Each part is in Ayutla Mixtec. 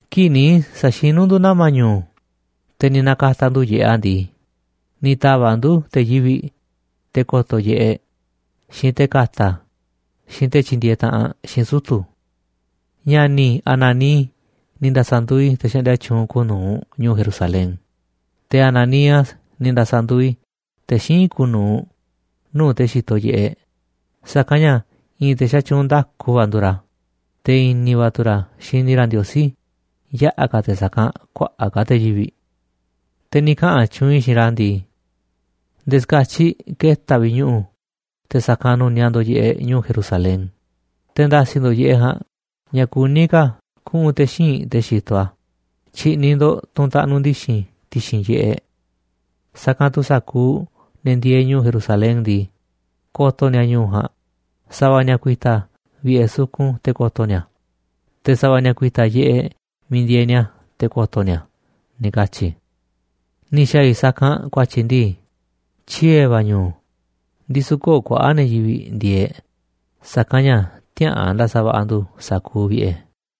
Kii̱ꞌ ni̱ sa̱xinu̱ ndu̱ nama̱ ñu̱u̱, te̱ ni̱ na̱ka̱ta̱ ndu̱ yiꞌeꞌ a̱ ndii, ni̱ ta̱va̱ꞌ ndu̱ te̱ yivi̱ꞌ, te̱ ko̱to̱ yiꞌeꞌ, xiinꞌ te̱ ka̱ta̱, xiinꞌ te̱ tyindieeꞌ taꞌanꞌ xiinꞌ sutu̱. Ña̱ni̱ i̱ Hanani ni̱ nda̱sa̱nduuꞌ i̱ te̱ xaꞌndia tyuunꞌ kuuꞌ nu̱uꞌ ñu̱u̱ Jerusalén, te̱ Hananías ni̱ nda̱sa̱nduuꞌ i̱ te̱ xíinꞌ kuuꞌ nu̱uꞌ nuu̱ꞌ te̱ xitoꞌ yiꞌeꞌ, sa̱kanꞌ ña̱ i̱i̱n te̱ xatyuunꞌ nda̱ku va̱ nduuꞌ ra̱, te̱ i̱ni̱ va̱ tu̱ ra̱ xini ra̱ Ndiosí yaꞌa̱ ka̱ te̱ sa̱kanꞌ kuaꞌa̱ꞌ ka̱ te̱ yivi̱ꞌ. Te̱ ni̱ kaꞌa̱n tyuunꞌ i̱ xiinꞌ ra̱ ndii: ―Nde̱e̱ xka̱tyiꞌ ke̱ta̱ vi̱ꞌ ñu̱ꞌu̱ te̱ sa̱kanꞌ nu̱niaꞌ ndo̱ꞌ yiꞌeꞌ ñu̱u̱ Jerusalén, te̱ nda̱si̱ ndo̱ꞌ yiꞌeꞌ ja̱a̱nꞌ ña̱ kuní ka̱ kuꞌu̱n te̱ xíinꞌ te̱ xitoꞌ a̱, tyi̱ꞌni̱ ndo̱ꞌ tunꞌ taꞌnuꞌ ndi̱xi̱n ti̱xi̱n yiꞌeꞌ. Sa̱kanꞌ tu̱ sa̱kuuꞌ ne̱ ndieeꞌ ñu̱u̱ Jerusalén ndii, ko̱to̱ ni̱a̱ ñu̱u̱ ja̱a̱nꞌ. Sa̱va̱ ni̱a̱ ku̱i̱ta̱ vi̱ꞌe̱ sukun te̱ ko̱to̱ ni̱a̱ a̱, te̱ sa̱va̱ ni̱a̱ ku̱i̱ta̱ yiꞌeꞌ miiꞌ ndieeꞌ ni̱a̱ te̱ ko̱to̱ ni̱a̱ a̱ ―ni̱ katyi i̱. Ni̱ xa̱a̱ i̱ sa̱kanꞌ ku̱a̱tyi̱ ndii, tyiee̱ va̱ ñu̱u̱, ndisu̱ köo̱ꞌ kuaꞌa̱ꞌ ne̱ yivi̱ꞌ ndieeꞌ, sa̱kanꞌ ña̱ tiäa̱ꞌan nda̱sa̱va̱ꞌa̱ ndu̱ sa̱kuuꞌ vi̱ꞌe̱.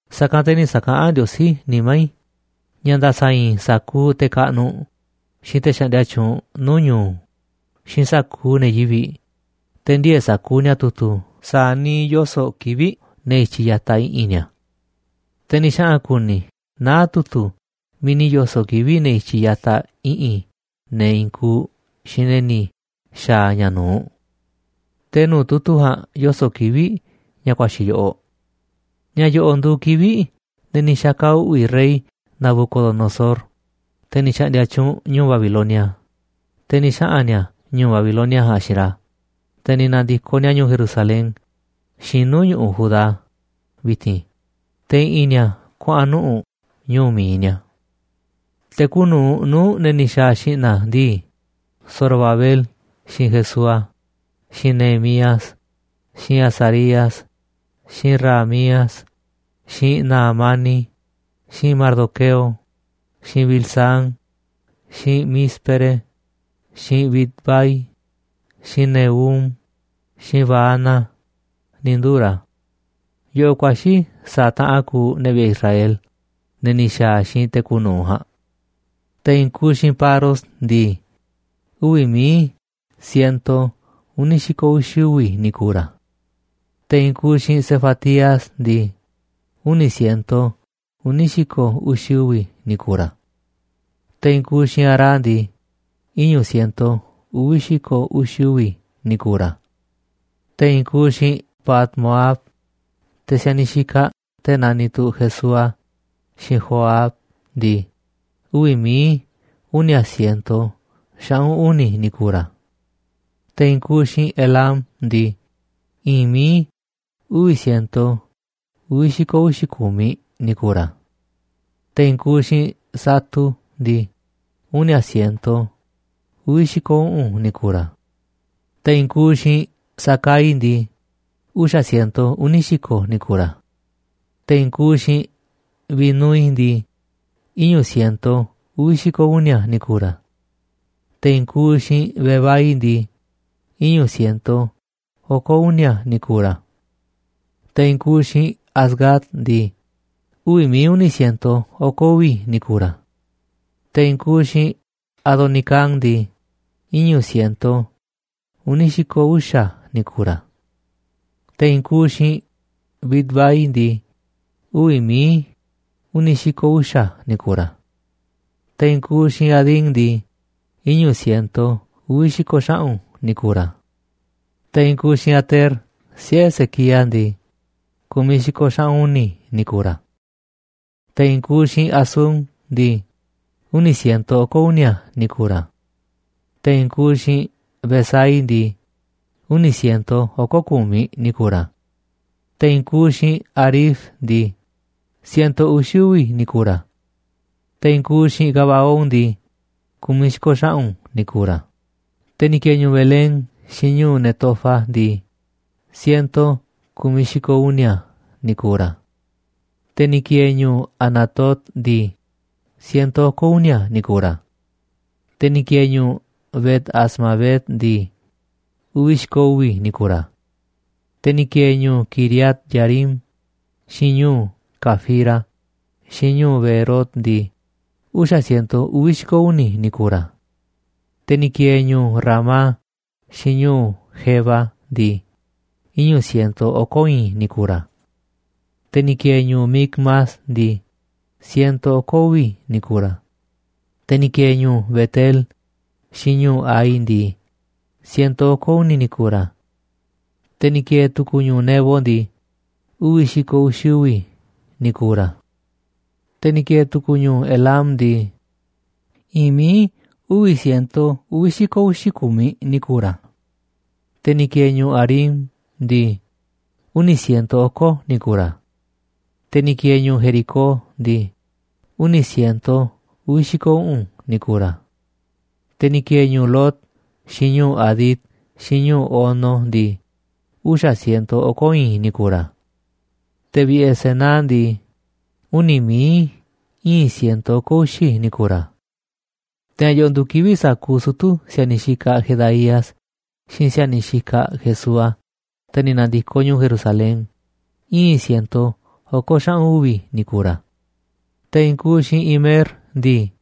Sa̱kanꞌ te̱ ni̱ sa̱kaꞌán Ndiosí nimá i̱ ña̱ nda̱sa̱i̱i̱n i̱ sa̱kuuꞌ te̱ kaꞌnuꞌ, xiinꞌ te̱ xaꞌndia tyuunꞌ nuu̱ꞌ ñu̱u̱, xiinꞌ sa̱kuuꞌ ne̱ yivi̱ꞌ, te̱ ndiee̱ sa̱kuuꞌ ni̱a̱ tu̱tu̱ sa̱a̱ niiꞌ yoso̱ꞌ kivi̱ꞌ ne̱ i̱tyiꞌ ya̱taꞌ i̱ꞌi̱n ni̱a̱. Te̱ ni̱ xaꞌa̱n ku̱ni̱ i̱ naá tu̱tu̱ miiꞌ ni̱ yo̱so̱ꞌ kivi̱ꞌ ne̱ i̱tyiꞌ ya̱taꞌ i̱ꞌi̱n ne̱ i̱i̱n kuuꞌ xiinꞌ ne̱ ni̱ xa̱a̱ ña̱ nu̱uꞌ. Te̱ nuu̱ꞌ tu̱tu̱ ja̱a̱nꞌ yoso̱ꞌ kivi̱ꞌ ña̱ ku̱a̱xi̱ yoꞌoꞌ: Ña̱ yo̱ꞌo̱ꞌ nduuꞌ kivi̱ꞌ ne̱ ni̱ xa̱ka̱ uꞌvi̱ rey Nabucodonosor, te̱ ni̱ xa̱ꞌndi̱a̱ tyuunꞌ ñu̱'uꞌ Babilonia, te̱ ni̱ xaꞌa̱n ni̱a̱ ñu̱'uꞌ Babilonia ja̱a̱nꞌ xiinꞌ ra̱, te̱ ni̱ na̱ndi̱koꞌ ni̱a̱ ñu̱u̱ Jerusalén xiinꞌ nuu̱ꞌ ñu̱ꞌuꞌ Judá vi̱ti̱n, te̱ i̱ꞌi̱n ni̱a̱ kuaꞌa̱n nuꞌu̱ꞌ ñu̱u̱ mi̱iꞌ ni̱a̱. Te̱ kuuꞌ nu̱uꞌ nuu̱ꞌ ne̱ ni̱ xa̱a̱ xi̱ꞌna̱ ndii, Zorobabel xiinꞌ Jesúa, xiinꞌ Nehemías, xiinꞌ Azarías, xiinꞌ Raamías, xiinꞌ Nahamani, xiinꞌ Mardoqueo, xiinꞌ Bilsán, xiinꞌ Mísperet, xiinꞌ Bigvai, xiinꞌ Nehum, xiinꞌ Baana, ni̱ nduu̱ ra̱. Yoꞌoꞌ ku̱a̱xi̱ sa̱a̱ taꞌan kuuꞌ ne̱ vi̱ꞌe̱ Israel, ne̱ ni̱ xa̱a̱ xiinꞌ te̱ kuuꞌ nu̱uꞌ ja̱a̱nꞌ: Te̱ i̱i̱n kuuꞌ xiinꞌ Paros ndii, uvi̱ mií siento uni̱ xi̱ko̱ uxi̱ uvi̱ ni̱ ku̱u̱ ra̱. Te̱ i̱i̱n kuuꞌ xiinꞌ Sefatías ndii, uni̱ siento uni̱ uxi̱ uvi̱ ni̱ ku̱u̱ ra̱. Te̱ i̱i̱n kuuꞌ xiinꞌ Ara ndii, iñu̱ siento uvi̱ xi̱ko̱ uxi̱ uvi̱ ni̱ ku̱u̱ ra̱. Te̱ i̱i̱n kuuꞌ xiinꞌ Pahat-moab, te̱ si̱a̱niꞌ xikaꞌ te̱ naniꞌ tu̱ Jesúa xiinꞌ Joab ndii, uvi̱ mií uni̱a̱ siento xaꞌu̱n uni̱ ni̱ ku̱u̱ ra̱. Te̱ i̱i̱n kuuꞌ xiinꞌ Elam ndii, i̱i̱n mií uvi̱ siento uvi̱ xi̱ko̱ uxi̱ ku̱miꞌ ni̱ ku̱u̱ ra̱. Te̱ i̱i̱n kuuꞌ xiinꞌ Zatu ndii, uni̱a siento uvi̱ xi̱ko̱ uꞌu̱n ni̱ ku̱u̱ ra̱. Te̱ i̱i̱n kuuꞌ xiinꞌ Zacai ndii, uxa̱ siento uni̱ xi̱ko̱ ni̱ ku̱u̱ ra̱. Te̱ i̱i̱n kuuꞌ xiinꞌ Binúi ndii, iñu̱ siento uvi̱ xi̱ko̱ uni̱a̱ ni̱ ku̱u̱ ra̱. Te̱ i̱i̱n kuuꞌ xiinꞌ Bebai ndii, iñu̱ siento oko̱ uni̱a̱ ni̱ ku̱u̱ ra̱. Te̱ i̱i̱n kuuꞌ xiinꞌ Azgad ndii, uvi̱ mií uni̱ siento oko̱ uvi̱ ni̱ ku̱u̱ ra̱. Te̱ i̱i̱n kuuꞌ xiinꞌ Adonicam ndii, iñu̱ siento uni̱ xi̱ko̱ uxa̱ ni̱ ku̱u̱ ra̱. Te̱ i̱i̱n kuuꞌ xiinꞌ Bigvai ndii, uvi̱ mií uni̱ xi̱ko̱ uxa̱ ni̱ ku̱u̱ ra̱. Te̱ i̱i̱n kuuꞌ xiinꞌ Adín ndii, iñu̱ siento uvi̱ xi̱ko̱ xaꞌu̱n ni̱ ku̱u̱ ra̱. Te̱ i̱i̱n kuuꞌ xiinꞌ Ater, siꞌe̱ Ezequías ndii, ku̱miꞌ xi̱ko̱ xaꞌu̱n uni̱ ni̱ ku̱u̱ ra̱. Te̱ i̱i̱n kuuꞌ xiinꞌ Hasum ndii, uni̱ siento oko̱ uni̱a̱ ni̱ ku̱u̱ ra̱. Te̱ i̱i̱n kuuꞌ xiinꞌ Bezai ndii, uni̱ siento oko̱ ku̱miꞌ ni̱ ku̱u̱ ra̱. Te̱ i̱i̱n kuuꞌ xiinꞌ Harif ndii, siento uxi̱ uvi̱ ni̱ ku̱u̱ ra̱. Te̱ i̱i̱n kuuꞌ xiinꞌ Gabaón ndii, ku̱miꞌ xi̱ko̱ xaꞌu̱n ni̱ ku̱u̱ ra̱. Te̱ ni̱ ki̱e̱e̱ ñu̱u̱ Belén xiinꞌ ñu̱u̱ Netofa ndii, siento ku̱miꞌ xi̱ko̱ uni̱a̱ ni̱ ku̱u̱ ra̱. Te̱ ni̱ ki̱e̱e̱ ñu̱u̱ Anatot ndii, siento oko̱ uni̱a̱ ni̱ ku̱u̱ ra̱. Te̱ ni̱ ki̱e̱e̱ ñu̱u̱ Bet-azmavet ndii, uvi̱ xi̱ko̱ ni̱ ku̱u̱ ra̱. Te̱ ni̱ ki̱e̱e̱ ñu̱u̱ Quiriat-jearín, xiinꞌ ñu̱u̱ Cafira, xiinꞌ ñu̱u̱ Beerot ndii, uxa̱ siento uvi̱ xi̱ko̱ uni̱ ni̱ ku̱u̱ ra̱. Te̱ ni̱ ki̱e̱e̱ ñu̱u̱ Ramá xiinꞌ ñu̱u̱ Geba ndii, iñu̱ siento oko̱ i̱i̱n ni̱ ku̱u̱ ra̱. Te̱ ni̱ ki̱e̱e̱ ñu̱u̱ Micmas ndii, siento oko̱ uvi̱ ni̱ ku̱u̱ ra̱. Te̱ ni̱ ki̱e̱e̱ ñu̱u̱ Bet-el xiinꞌ ñu̱u̱ Hai ndii, siento oko̱ uni̱ ni̱ ku̱u̱ ra̱. Te̱ ni̱ ki̱e̱e̱ tu̱ku̱ ñu̱u̱ Nebo ndii, uvi̱ xi̱ko̱ uxi̱ uvi̱ ni̱ ku̱u̱ ra̱. Te̱ ni̱ ki̱e̱e̱ tu̱ku̱ ñu̱u̱ Elam ndii, i̱i̱n mií uvi̱ siento uvi̱ xi̱ko̱ uxi̱ ku̱miꞌ ni̱ ku̱u̱ ra̱. Te̱ ni̱ ki̱e̱e̱ ñu̱u̱ Harim ndii, uni̱ siento oko̱ ni̱ ku̱u̱ ra̱. Te̱ ni̱ ki̱e̱e̱ ñu̱u̱ Jericó ndii, uni̱ siento uvi̱ xi̱ko̱ uꞌu̱n ni̱ ku̱u̱ ra̱. Te̱ ni̱ ki̱e̱e̱ ñu̱u̱ Lod, xiinꞌ ñu̱u̱ Hadid, xiinꞌ ñu̱u̱ Ono ndii, uxa̱ siento oko̱ i̱i̱n ni̱ ku̱u̱ ra̱. Te̱ vi̱ꞌe̱ Senaa ndii, uni̱ mií íin siento oko̱ uxi̱ ni̱ ku̱u̱ ra̱. Te̱ ña̱ yo̱ꞌo̱ nduuꞌ kivi̱ꞌ sa̱kuuꞌ sutu̱ si̱a̱niꞌ xikaꞌ Jedaías, xiinꞌ si̱a̱niꞌ xikaꞌ Jesúa, te̱ ni̱ na̱ndi̱koꞌ ñu̱u̱ Jerusalen, íin siento oko̱ xaꞌu̱n uvi̱ ni̱ ku̱u̱ ra̱. Te̱ i̱i̱n kuuꞌ xiinꞌ Imer ndii,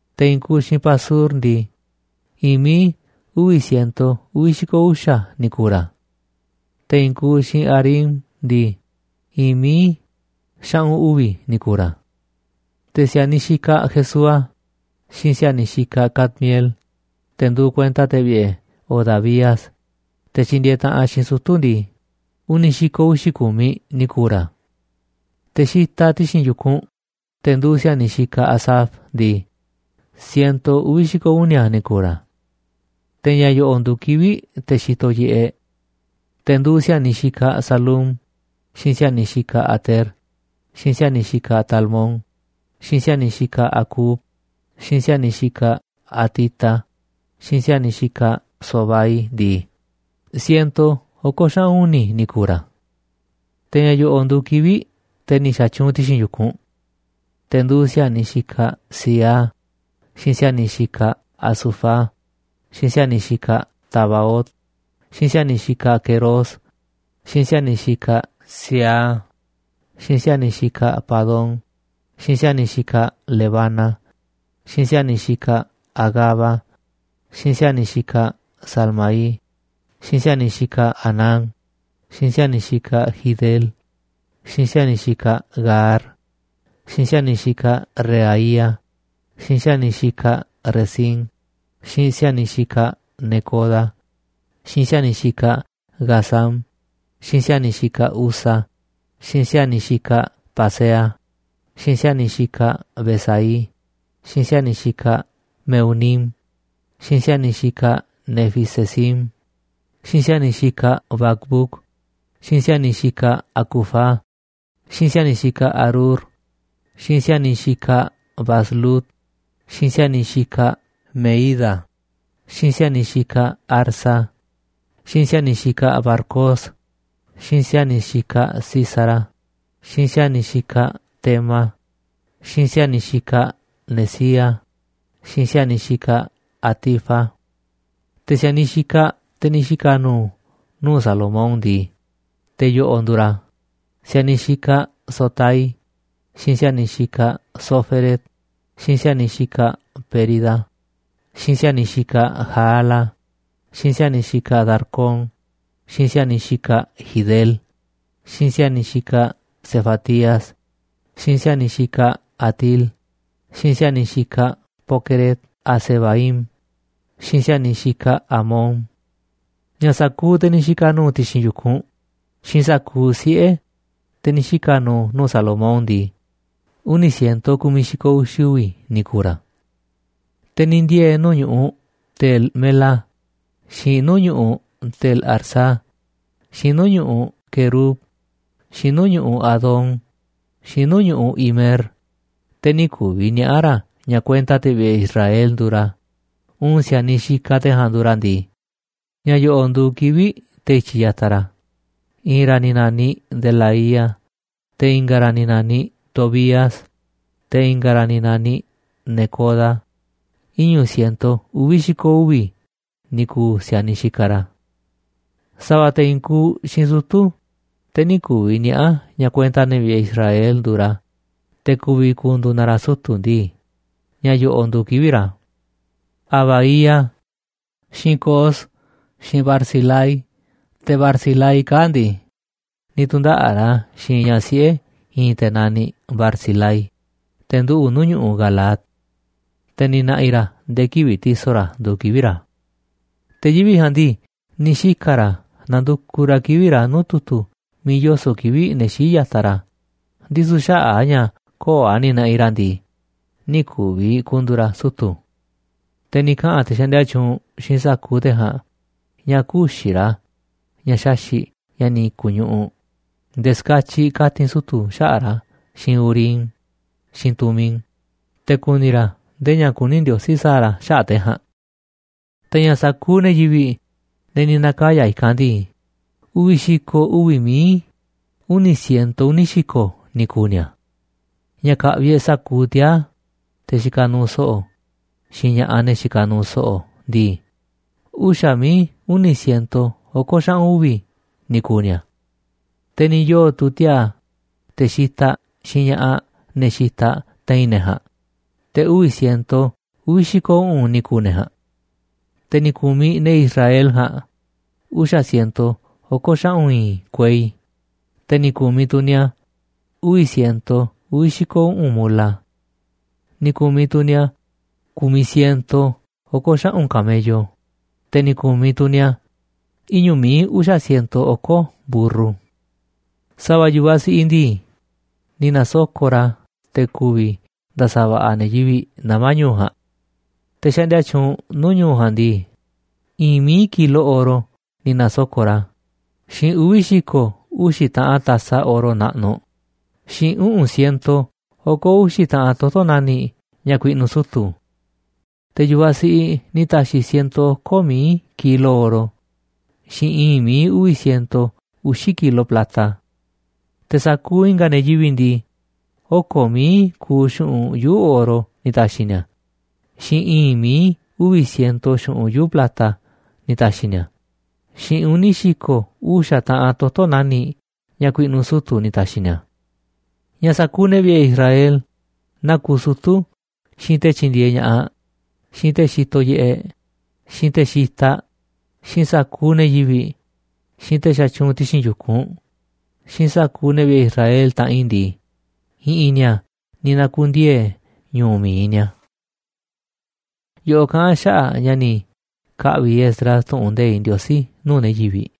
Te̱ i̱i̱n kuuꞌ xiinꞌ Pasur ndii, i̱i̱n mií uvi̱ siento uvi̱ xi̱ko̱ uxa̱ ni̱ ku̱u̱ ra̱. Te̱ i̱i̱n kuuꞌ xiinꞌ Harim ndii, i̱i̱n mií xaꞌu̱n uvi̱ ni̱ ku̱u̱ ra̱. Te̱ si̱a̱niꞌ xikaꞌ Jesúa, xiinꞌ si̱a̱niꞌ xikaꞌ Cadmiel, te̱ nduuꞌ kuenta te̱ vi̱ꞌe̱ Hodavías, te̱ tyindieeꞌ taꞌanꞌ xiinꞌ sutu̱ ndii, uni̱ xi̱ko̱ uxi̱ ku̱miꞌ ni̱ ku̱u̱ ra̱. Te̱ xitaꞌ ti̱xi̱n yu̱kunꞌ, te̱ nduuꞌ si̱a̱niꞌ xikaꞌ Asaf ndii, siento uvi̱ xi̱ko̱ uni̱a̱ ni̱ ku̱u̱ ra̱. Te̱ ña̱ yo̱ꞌo̱ꞌ nduuꞌ kivi̱ꞌ te̱ xitoꞌ yiꞌeꞌ: Te̱ nduuꞌ si̱a̱niꞌ xikaꞌ Salum, xiinꞌ si̱a̱niꞌ xikaꞌ Ater, xiinꞌ si̱a̱niꞌ xikaꞌ Talmón, xiinꞌ si̱a̱niꞌ xikaꞌ Acub, xiinꞌ si̱a̱niꞌ xikaꞌ Hatita, xiinꞌ si̱a̱niꞌ xikaꞌ Sobai ndii, siento oko̱ xaꞌu̱n uni̱ ni̱ ku̱u̱ ra̱. Te̱ ña̱ yo̱ꞌo̱ꞌ nduuꞌ kivi̱ꞌ te̱ ni̱ xa̱tyuunꞌ ti̱xi̱n yu̱kunꞌ: Te̱ nduuꞌ si̱a̱niꞌ xikaꞌ Ziha, xiinꞌ si̱a̱niꞌ xikaꞌ Hasufa, xiinꞌ si̱a̱niꞌ xikaꞌ Tabaot, xiinꞌ si̱a̱niꞌ xikaꞌ Queros, xiinꞌ si̱a̱niꞌ xikaꞌ Siaha, xiinꞌ si̱a̱niꞌ xikaꞌ Padón, xiinꞌ si̱a̱niꞌ xikaꞌ Lebana, xiinꞌ si̱a̱niꞌ xikaꞌ Hagaba, xiinꞌ si̱a̱niꞌ xikaꞌ Salmai, xiinꞌ si̱a̱niꞌ xikaꞌ Hanán, xiinꞌ si̱a̱niꞌ xikaꞌ Gidel, xiinꞌ si̱a̱niꞌ xikaꞌ Gahar, xiinꞌ si̱a̱niꞌ xikaꞌ Reaía, xiinꞌ si̱a̱niꞌ xikaꞌ Rezín, xiinꞌ si̱a̱niꞌ xikaꞌ Necoda, xiinꞌ si̱a̱niꞌ xikaꞌ Gazam, xiinꞌ si̱a̱niꞌ xikaꞌ Uza, xiinꞌ si̱a̱niꞌ xikaꞌ Paseah, xiinꞌ si̱a̱niꞌ xikaꞌ Besai, xiinꞌ si̱a̱niꞌ xikaꞌ Mehunim, xiinꞌ si̱a̱niꞌ xikaꞌ Nefisesim, xiinꞌ si̱a̱niꞌ xikaꞌ Bacbuc, xiinꞌ si̱a̱niꞌ xikaꞌ Hacufa, xiinꞌ si̱a̱niꞌ xikaꞌ Harhur, xiinꞌ si̱a̱niꞌ xikaꞌ Bazlut, xiinꞌ si̱a̱niꞌ xikaꞌ Mehída, xiinꞌ si̱a̱niꞌ xikaꞌ Harsa, xiinꞌ si̱a̱niꞌ xikaꞌ Barcos, xiinꞌ si̱a̱niꞌ xikaꞌ Sísara, xiinꞌ si̱a̱niꞌ xikaꞌ Tema, xiinꞌ si̱a̱niꞌ xikaꞌ Nezía, xiinꞌ si̱a̱niꞌ xikaꞌ Hatifa. Te̱ si̱a̱niꞌ xikaꞌ te̱ ni̱ xika̱ nu̱u̱ nuu̱ꞌ Salomón ndii, te̱ yo̱ꞌo̱ꞌ nduuꞌ ra̱: Si̱a̱niꞌ xikaꞌ Sotai, xiinꞌ si̱a̱niꞌ xikaꞌ Soféret, xiinꞌ si̱a̱niꞌ xikaꞌ Perida, xiinꞌ si̱a̱niꞌ xikaꞌ Jaala, xiinꞌ si̱a̱niꞌ xikaꞌ Darcón, xiinꞌ si̱a̱niꞌ Gidel, xiinꞌ si̱a̱niꞌ xikaꞌ Sefatías, xiinꞌ si̱a̱niꞌ xikaꞌ Hatil, xiinꞌ si̱a̱niꞌ xikaꞌ Poqueret-hazebaim, xiinꞌ si̱a̱niꞌ xikaꞌ Amón. Ña̱ sa̱kuuꞌ te̱ ni̱ xika̱ nu̱u̱ ti̱xi̱n yu̱kunꞌ, xiinꞌ sa̱kuuꞌ siꞌe̱, te̱ ni̱ xika̱ nu̱u̱ nuu̱ꞌ Salomón ndii, uni̱ siento ku̱miꞌ xi̱ko̱ uxi̱ uvi̱ ni̱ ku̱u̱ ra̱. Te̱ ni̱ ndiee̱ nuu̱ꞌ ñu̱ꞌuꞌ Tel-mela, xiinꞌ nuu̱ꞌ ñu̱ꞌuꞌ Tel-harsa, xiinꞌ nuu̱ꞌ ñu̱ꞌuꞌ Querub, xiinꞌ nuu̱ꞌ ñu̱ꞌuꞌ Adón, xiinꞌ nuu̱ꞌ ñu̱ꞌuꞌ Imer, te̱ nï̱ ku̱vi̱ niaꞌa̱ ra̱ ña̱ kuenta te̱ vi̱ꞌe̱ Israel nduuꞌ ra̱, uun si̱a̱niꞌ xikaꞌ te̱ ja̱a̱nꞌ nduuꞌ ra̱ ndii, ña̱ yo̱ꞌo̱ꞌ nduuꞌ kivi̱ꞌ te̱ i̱tyiꞌ ya̱taꞌ ra̱: I̱i̱n ra̱ ni̱ na̱niꞌ Delaía, te̱ i̱nga̱ ra̱ ni̱ na̱niꞌ Tobías, te̱ i̱nga̱ ra̱ ni̱ na̱niꞌ Necoda, iñu̱ siento uvi̱ xi̱ko̱ uvi̱ ni̱ ku̱u̱ si̱a̱niꞌ xikaꞌ ra̱. Sa̱va̱ te̱ i̱i̱n kuuꞌ xiinꞌ sutu̱ te̱ nï̱ ku̱vi̱ niaꞌa̱ ña̱ kuenta ne̱ vi̱ꞌe̱ Israel nduuꞌ ra̱, te̱ ku̱vi̱ ku̱ndu̱u̱ na ra̱ sutu̱ ndii, ña̱ yoꞌoꞌ nduuꞌ kivi̱ꞌ ra̱: Habaía, xiinꞌ Cos, xiinꞌ Barzilai. Te̱ Barzilai kaa̱ꞌ ndii, ni̱ tu̱ndaꞌa̱ꞌ ra̱ xiinꞌ ñaꞌ siꞌe̱ i̱i̱n te̱ naniꞌ Barzilai, te̱ nduꞌu̱ꞌ nuu̱ꞌ ñu̱ꞌuꞌ Galaad. Te̱ ni̱ na̱ꞌi̱ ra̱ nde̱e̱ kivi̱ꞌ ti̱so̱ ra̱ nduuꞌ kivi̱ꞌ ra̱. Te̱ yivi̱ꞌ ja̱a̱nꞌ ndii, ni̱ xika̱ ra̱ nandukuꞌ ra̱ kivi̱ꞌ ra̱ nuu̱ꞌ tu̱tu̱ miiꞌ yoso̱ꞌ kivi̱ꞌ ne̱ xíiꞌ ya̱taꞌ ra̱, ndisu̱ xaꞌa̱ꞌ a̱ ña̱ köo̱ꞌ a̱ ni̱ na̱ꞌi̱ ra̱ ndii, nï̱ ku̱vi̱ ku̱ndu̱u̱ ra̱ sutu̱. Te̱ ni̱ kaꞌa̱n te̱ xaꞌndia tyuunꞌ xiinꞌ sa̱kuuꞌ te̱ ja̱a̱nꞌ ña̱ kü̱xi̱ ra̱ ña̱ xaxi̱ꞌ ña̱ ni̱ ku̱ñuꞌuꞌ, nde̱e̱ ska̱tyiꞌ ka̱ti̱n sutu̱ xaꞌa̱ꞌ ra̱ xiinꞌ Urim xiinꞌ Tumim, te̱ ku̱ni̱ ra̱ ndee ña̱ kuní Ndiosí sa̱a̱ ra̱ xaꞌa̱ꞌ te̱ ja̱a̱nꞌ. Te̱ ña̱ sa̱kuuꞌ ne̱ yivi̱ꞌ, ne̱ ni̱ na̱kaya̱ i̱kanꞌ ndii, uvi̱ xi̱ko̱ uvi̱ mií uni̱ siento uni̱ xi̱ko̱ ni̱ ku̱u̱ ni̱a̱. Ña̱ ka̱ꞌvi̱ e̱ꞌ sa̱kuuꞌ tiaa̱, te̱ xikaꞌ nuuꞌ so̱ꞌo̱, xiinꞌ ña̱ꞌaꞌ ne̱ xikaꞌ nuuꞌ so̱ꞌo̱ ndii, uxa̱ mií uni̱ siento oko̱ xaꞌu̱n uvi̱ ni̱ kuuꞌ ni̱a̱. Te̱ ni̱ yoo̱ tu̱ tiaa̱, te̱ xitaꞌ, xiinꞌ ña̱ꞌaꞌ, ne̱ xitaꞌ, te̱i̱n ne̱ ja̱a̱nꞌ, te̱ uvi̱ siento uvi̱ xi̱ko̱ uꞌu̱n ni̱ ku̱u̱ ne̱ ja̱a̱nꞌ. Te̱ ni̱ ku̱miꞌ ne̱ Israel ja̱a̱nꞌ uxa̱ siento oko̱ xaꞌu̱n i̱i̱n kuei, te̱ ni̱ ku̱miꞌ tu̱ ni̱a̱ uvi̱ siento uvi̱ xi̱ko̱ uꞌu̱n mula. Ni̱ ku̱miꞌ tu̱ ni̱a̱ ku̱miꞌ siento oko̱ xaꞌu̱n camello, te̱ ni̱ ku̱miꞌ tu̱ ni̱a̱ iñu̱ mií uxa̱ siento oko̱ mburru. Sa̱va̱ yu̱vaꞌ siꞌiꞌ ndii, ni̱ na̱soko̱ꞌ ra̱ te̱ ku̱vi̱ nda̱sa̱va̱ꞌa̱ ne̱ yivi̱ꞌ nama̱ ñu̱u̱ ja̱a̱nꞌ. Te̱ xaꞌndia tyuunꞌ nuu̱ꞌ ñu̱u̱ ja̱a̱nꞌ ndii, i̱i̱n míi kilo oro ni̱ na̱soko̱ꞌ ra̱, xiinꞌ uvi̱ xi̱ko̱ uxi̱ taꞌan taza oro naꞌnuꞌ, xiinꞌ uꞌu̱n siento oko̱ uxi̱ taꞌan toto̱ nani̱ꞌ ña̱ ku̱i̱ꞌnu̱ sutu̱. Te̱ yu̱vaꞌ siꞌiꞌ ni̱ ta̱xi̱ siento oko̱ mií kilo oro xiinꞌ i̱i̱n mií uvi̱ siento uxi̱ kilo plata. Te̱ sa̱kuuꞌ i̱nga̱ ne̱ yivi̱ꞌ ndii, oko̱ mií kuuꞌ xu̱ꞌunꞌ yuu̱ꞌ oro ni̱ ta̱xi̱ ni̱a̱, xiinꞌ i̱i̱n mií uvi̱ siento xu̱ꞌunꞌ yuu̱ꞌ plata ni̱ ta̱xi̱ ni̱a̱, xiinꞌ uni̱ xi̱ko̱ uxa̱ taꞌanꞌ toto̱ nani̱ꞌ ña̱ ku̱i̱ꞌnu̱ sutu̱ ni̱ ta̱xi̱ ni̱a̱. Ña̱ sa̱kuuꞌ ne̱ vi̱ꞌe̱ Israel, naa kuuꞌ sutu̱, xiinꞌ te̱ tyindieeꞌ ña̱ꞌaꞌ, xiinꞌ te̱ xitoꞌ yiꞌeꞌ, xiinꞌ te̱ xitaꞌ, xiinꞌ sa̱kuuꞌ ne̱ yivi̱ꞌ, xiinꞌ te̱ xatyuunꞌ ti̱xi̱n yu̱kunꞌ, xiinꞌ sa̱kuuꞌ ne̱ vi̱ꞌe̱ Israel, taꞌanꞌ i̱ ndii, i̱ꞌi̱n ni̱a̱ ni̱ na̱ku̱ndiee̱ ñu̱u̱ mi̱iꞌ ni̱a̱. Yoꞌoꞌ kaꞌán a̱ xaꞌa̱ꞌ ña̱ ni̱ ka̱ꞌvi̱ Esdras tu̱ꞌu̱n nde̱iꞌ Ndiosí nuu̱ꞌ ne̱ yivi̱ꞌ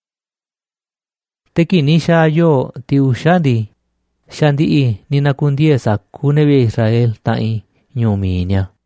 Te̱ kii̱ꞌ ni̱ xa̱a̱ yoo̱ꞌ tiꞌ uxa̱ ndii, xa̱ ndi̱ꞌi̱ ni̱ na̱ku̱ndiee̱ sa̱kuuꞌ ne̱ vi̱ꞌe̱ Israel, taꞌanꞌ i̱, ñu̱u̱ mi̱iꞌ ni̱a̱.